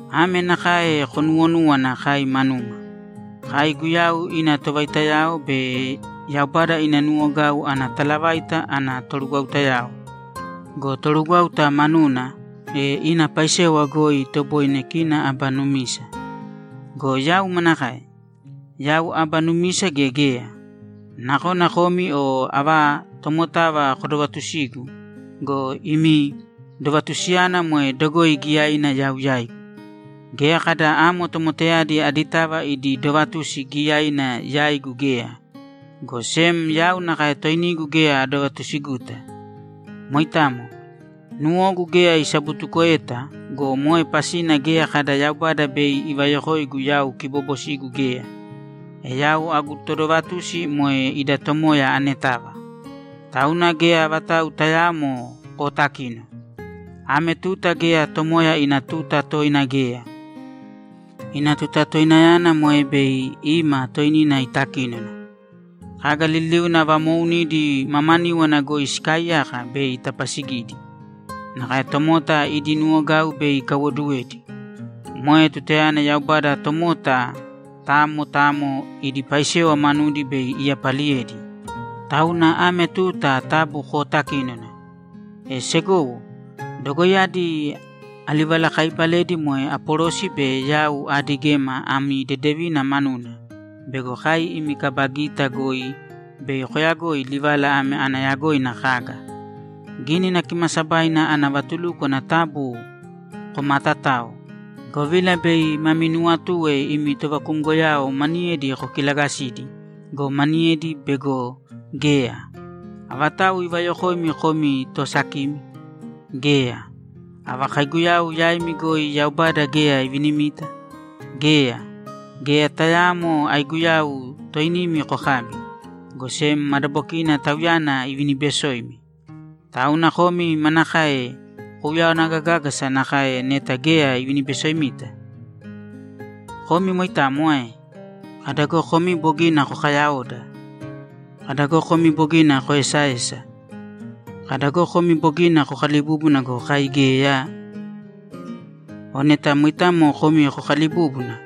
Ame nakae konuwonūwana kai manuma: Kai Guyau ina tovaitayao be Yaubada ina nuwogau ana talavaita ana torugwautayao. Go torugwáuta manuna, e ina paisewa goi itoboine kina aba numisa. Go yau manakae? Yau aba numisa gea geya? Nakona komi o ava tomotava kodovatusigu go, imi dovatusiyana moe dogoi giyaina yau yaigu. Geya kada amo tomotayadi aditava idi dovatusi giyaina yaigu geya, go sem yau nakae toinigu geya adovatusiguta. Moitamo. Nuwogu geya isabutukoeta go, moe pasina geya kada Yaubada bei ivayokoigu yau kiboobosigu geya. E yau agu todovatusi moe ida Tomoya anetava. Tauna geya vatau tayaamo kootakīno. Ame tuta geya Tomoya ina tuta toina geya. Ina tuta toinayana moe bei ima toinina itakínona. Kaga liliuna vamoounidi mamaníwana goi sikaaiyaka bei itapasigidi. Nakae tomota idi nuwogau bei ikaiwoduwedi. Moe tutayana Yaubada tomota tamo tamo idi paisewa manudi bei iyapaliyedi. Tauna ame tuta taabu kootakīnona. E segowo, dogoiyadi alivalakaaibaledi moe Apolosi be yau aadigema ami dedevina manuna bego kai imi kaba gita goi bei koyagoi livala ame ana yagoina kaga: Gínina Kimaasabaina ana vatulúkwana taabu komaatatāo, govila bei mami nuwatue imi tovakumgoyao maniyedi kokilagasidi go, maniyedi bego geya. Avatau ivayokoimi komi toosakimi? Geya! Ava kaiguyau yaimi goi Yaubada geya ivinimita? Geya! Geya tayaamo aiguyau toinimi kokabi, go sem madabokina Tauyana ivinibesoimi. Tauna komi manakae kouyawana gagágasa nakae neta geya ivinibesoimita? Komi moitamo ae? Kada go komi bogina kokayaoda! Kada go komi bogina koesaesa! Kada go komi bogina kokalibúbuna go, kai geyaa! O neta moitamo komi kokaalibúbuna!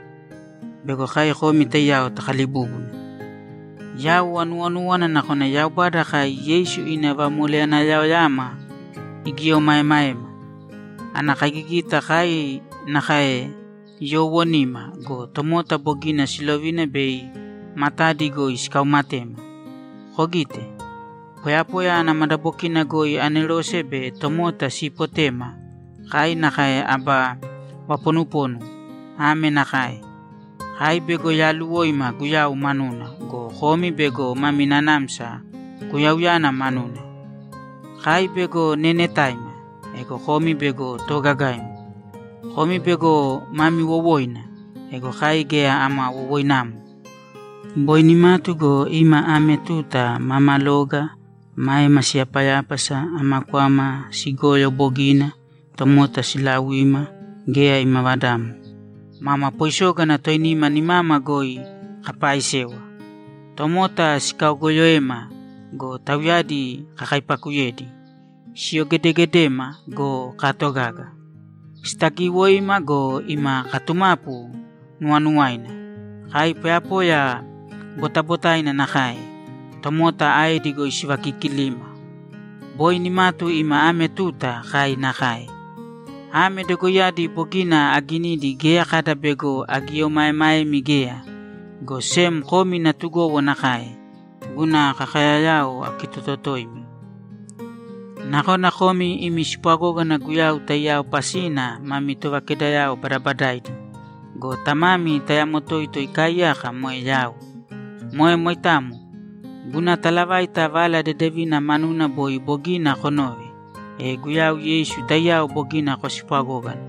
Bego kai komi taiyao takalibúbuna! Yau anuwonúwana nakona Yaubada kai Yeisu ina vamoleyanayaoyama igieomaemaema. Ana kaigigita kai nakae yoowonima go, tomota bogina silovina bei matadi goi sikaumatema. Kogite. Poyapoya ana madabokina goi anerose be tomota siipotema, kai nakae aba vaponuponu. Ame nakae: Kai bego yaaluwoima Guyau manuna go, komi bego mami nanamsa Guyauyana manuna. Kai bego neenetaima. Ego komi bego toogagaimi. Komi bego mami wowoina. Ego kai geya ama wowoinamo. Boi nimatu go, ima ame tuta maama loga, maema siyapayápasa, ama kwama sigoyo bogina, tomota siilauima, geya ima vadamo. Mama poisōgana toinima nimama goi kaapaisewa. Tomota sikaogooyoema go, tauyadi kakaipakuyedi. Siyogedegedema go, kaatogaga. Sitagiiwoima go, ima katumapu nuwanuwaina. Kai poyapoya botabotaina nakae, tomota aedi goi sivakikilima. Boi nimatu ima ame tuta kai nakae. Ame dogoiyadi bogina aginidi geya kada bego agieomaemaemi geya, go sem komi natugowo nakae, guna kakayayao akitototoimi. Nakona komi imi spwagógana Guyau taiyao pasina mami tovakedayao badabadaaidi go, tamami tayamo toito ikaaiyaka moe yau. Moe moitamo. Guna talavaita Vala Dedevina manuna boi bogina konove, e Guyau Yeisu taiyao bogina kospwagógana.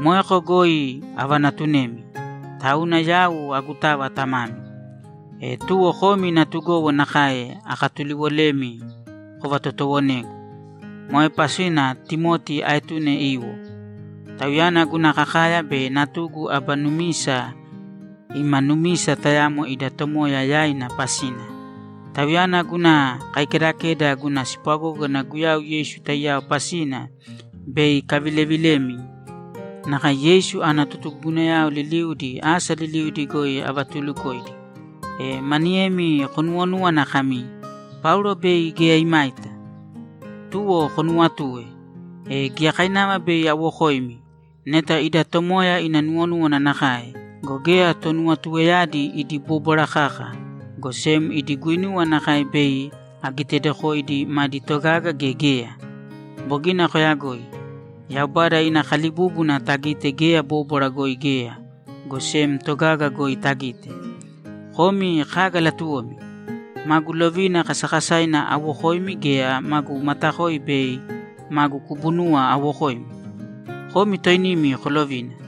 Moeko goi avanatunemi. Tauna yau agutava tamami. E tuwo komi natugowo nakae akatuliwolemi kovatotoowonēgu. Moe pasina Timoti aetune iwo. Tauyana guna kakaya be natugu aba numisa ima numisa tayamo ida Tomoya yaina pasina. Tauyana guna kaikedakeda guna spwagógana Guyau Yeisu taiyao pasina bei ikavilevilemi nakae Yeisu ana totugugunayao liliudi asa liliudi goi avatuulukoidi. E maniyemi konuwonúwana kami, ‘Paulo bei geya imaita.’ Tuwo konuwatue. E giyakainava bei awokoimi, neta ida Tomoya ina nuwonúwana nakae go, geya tonuwatueyadi idi bóbwara kaka, go sem idi guinuwa nakae bei agitedokoidi madi togaga gea geya. Bogina koyagoi. Yaubada ina kalibúbuna tagite geya bóbwara goi geya, go sem togaga goi tagite. Komi kaga latuwomi? Magu lovina kasakasaina awokoimi gea magu matakoi be magu kubunuwa awokoimi? Komi toinimi kolovina.